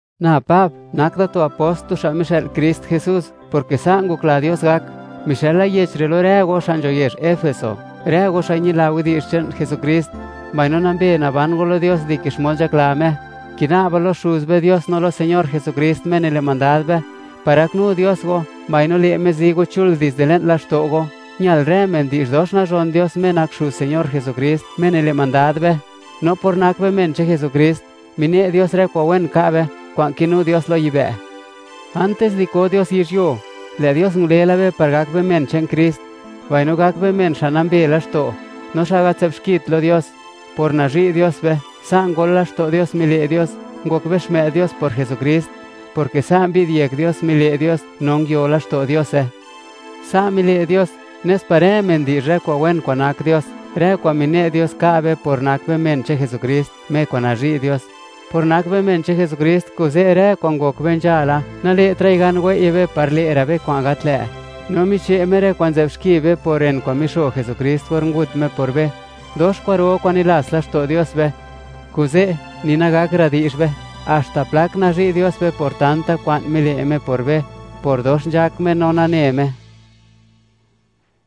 Na Pab, nak da tu apost, tu xa' mixë'l Krist Jesús, porke sa' ngokla Dios gak; mixëla yech re' lo rë go, xa' nzho yezh Efeso, rë go xa' ñila widi'zh che'n Jesukrist, mbaino nambe naban go lo Dios, dike xmod nzhakla Me. Kina'ba lo Xuz be Dios, no lo Señor Jesukrist Me nile' mandad be, par gaknu Dios go, mbaino le' Me zi go chul dizde le'n laxto' go. ¡Ñal rë men di'zh dox nazhon Dios, Me nak Xuz Señor Jesukrist, Me nile' mandad be! No por nak be men che'n Jesukrist, mine' Dios rë kwa'n wen ka' be, kwa'n kinu Dios lo yibë'. Antis di ko Dios yizhyuo, lë' Dios ngule la be, par gak be men che'n Krist, mbaino gak be men xa' nambe laxto', no xa' gat nzë'b xkit, lo Dios. Por nazhi' Dios be, sa' ngol laxto' Dios, mile' Dios, ngok be xmë'd Dios por Jesukrist; porke sa' mbi'd yek Dios, mile' Dios, no nguio laxto' Diose. Sa' mile' Dios, nes par rë men di'zh rë kwa'n wen kwa'n nak Dios, rë kwa'n mine' Dios ka' be, por nak be men che'n Jesukrist, Me kwa'n nazhi' Dios. Por nak be men che'n Jesukrist, kuze' rë kwa'n ngok be nzhala, nale'tra'i gan wei'ye be par le'ra' be kwa'n gat lë', no miche' Me rë kwa'n nzë'b xki be, por ren kwa'n mixo Jesukrist or ngut Me por be. ¡Dox kwa'ro kwa'n nilats laxto' Dios be! Kuze', ni nagakra' di'zh be, haxta plak nazhi' Dios be por tanta kwa'n mile' Me por be, por dox nzhak Me no nane Me.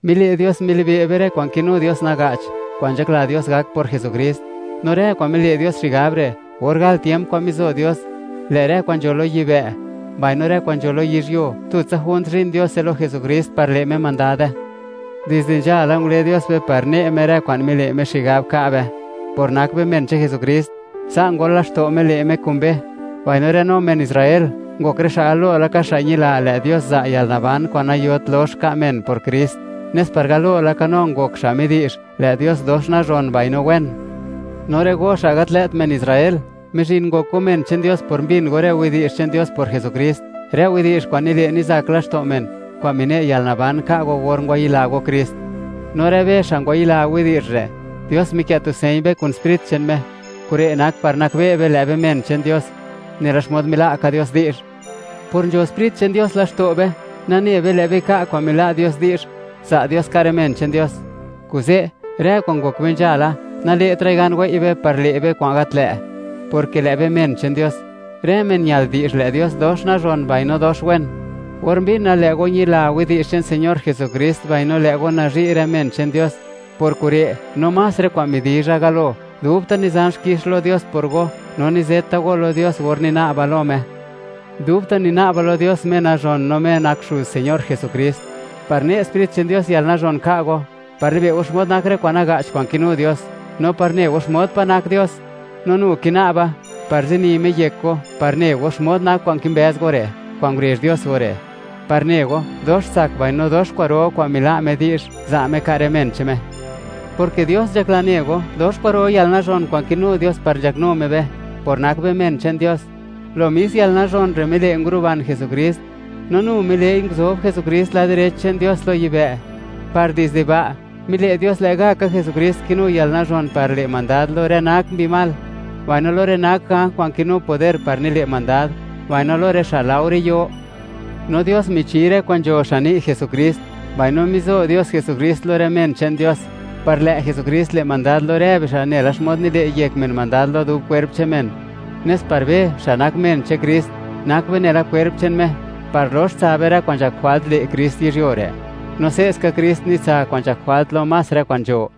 Mile' Dios, milibe' be rë kwa'n kinu Dios naga'ch, kwa'n nzhakla Dios gak por Jesukrist. No rë kwa'n mile' Dios xigab re', or gal tiemp kwa'n mizo Dios, lë' rë kwa'n nzho lo yibë', mbaino rë kwa'n nzho lo yizhyuo, tutsa junt zhin Diose lo Jesukrist par le' Me mandade. Dizde nzhala, ngule Dios be par ne' Me rë kwa'n mile' Me xigab ka' be, por nak be men che'n Jesukrist. Sa' ngol laxto' Me le' Me kun be. Mbaino, rë no men Israel, ngok rë xa' galo laka xa' ñila, lë' Dios za' yalnaban kwa'n nayot lox ka' men por Krist, nes par galo laka no ngok xa' midi'zh, ¡lë' Dios dox nazhon mbaino wen! No rë go, xa' gat lë't men Israel, mizhin go, ngok go men che'n Dios por mbin go rë widi'zh che'n Dios por Jesukrist, rë widi'zh kwa'n nile' nizak laxto' men, kwa'n mine' yalnaban ka' go or ngwayila go Krist. No rë be xa' ngwayila widi'zh re', Dios mikë' tu señ be kun Sprit che'n Me; kure' nak par nakbe' be, lë' be men che'n Dios, nela xmod mila' ka Dios di'zh. Por nzho Sprit che'n Dios laxto' be, nane be, lë' be ka' kwa'n mila' Dios di'zh, za' Dios ka' rë men che'n Dios. Kuze', rë kwa'n ngok be nzhala, nale'tra'i gan wei'ye be par lë' be kwa'n gat lë', porke lë' be men che'n Dios. Rë men ñal di'zh, ¡lë' Dios dox nazhon, mbaino dox wen! Or mbina, lë' go ñila widi'zh che'n Señor Jesukrist, mbaino lë' go nazhi' rë men che'n Dios, por kure', no más rë kwa'n midizha galo, dubta' nizan xkix lo Dios por go, no nizeta go lo Dios or nina'ba lo Me. Dubta' nina'ba lo Dios, Me nazhon no Me nak Xuz Señor Jesukrist, par ne' Sprit che'n Dios yalnazhon ka' go, par libe' go xmod nak rë kwa'n naga'ch kwa'n kinu Dios, no par ne go xmod pa' nak Dios. No nu kina'ba, par zini Me yek go, par ne go, xmod nak kwa'n kimbëz go re', kwa'n ngurezh Dios go re', par ne go, dox tsak, mbaino dox kwa'ro kwa'n mila' Me di'zh, za' Me, ka' rë men che'n Me, porke Dios nzhakla ne go, dox kwa'ro yalnazhon kwa'n kinu Dios par nzhaknu Me be, por nak be men che'n Dios. Lo mis yalnazhon re' mile' nguruban Jesukrist, no nu mile'i nguzob Jesukrist lad direch che'n Dios lo yibë', par dizde ba', mile' Dios, lë' ga' ka Jesukrist kinu yalnazhon par le' mandad lo rë nak mbi mal, mbaino lo rë nak ganj kwa'n kinu poder par nile' mandad; mbaino lo rë xa' laore yo. No rë kwa'n nzho michi Dios xan ni' Jesukrist, mbaino mizo Dios Jesukrist lo rë men che'n Dios, par lë' Jesukrist le' mandad lo rë bixa', nela xmod nile' yek men mandad lo dub kwerp che'n men, nes par be, xa' nak men che'n Krist, nak be nela kwerp che'n Me, par lox tsa be rë kwa'n nzhak jwalt le' Krist yizhyuo re'; no se'ska Krist nitsa kwa'n nzhak jwalt lo más rë kwa'n nzho.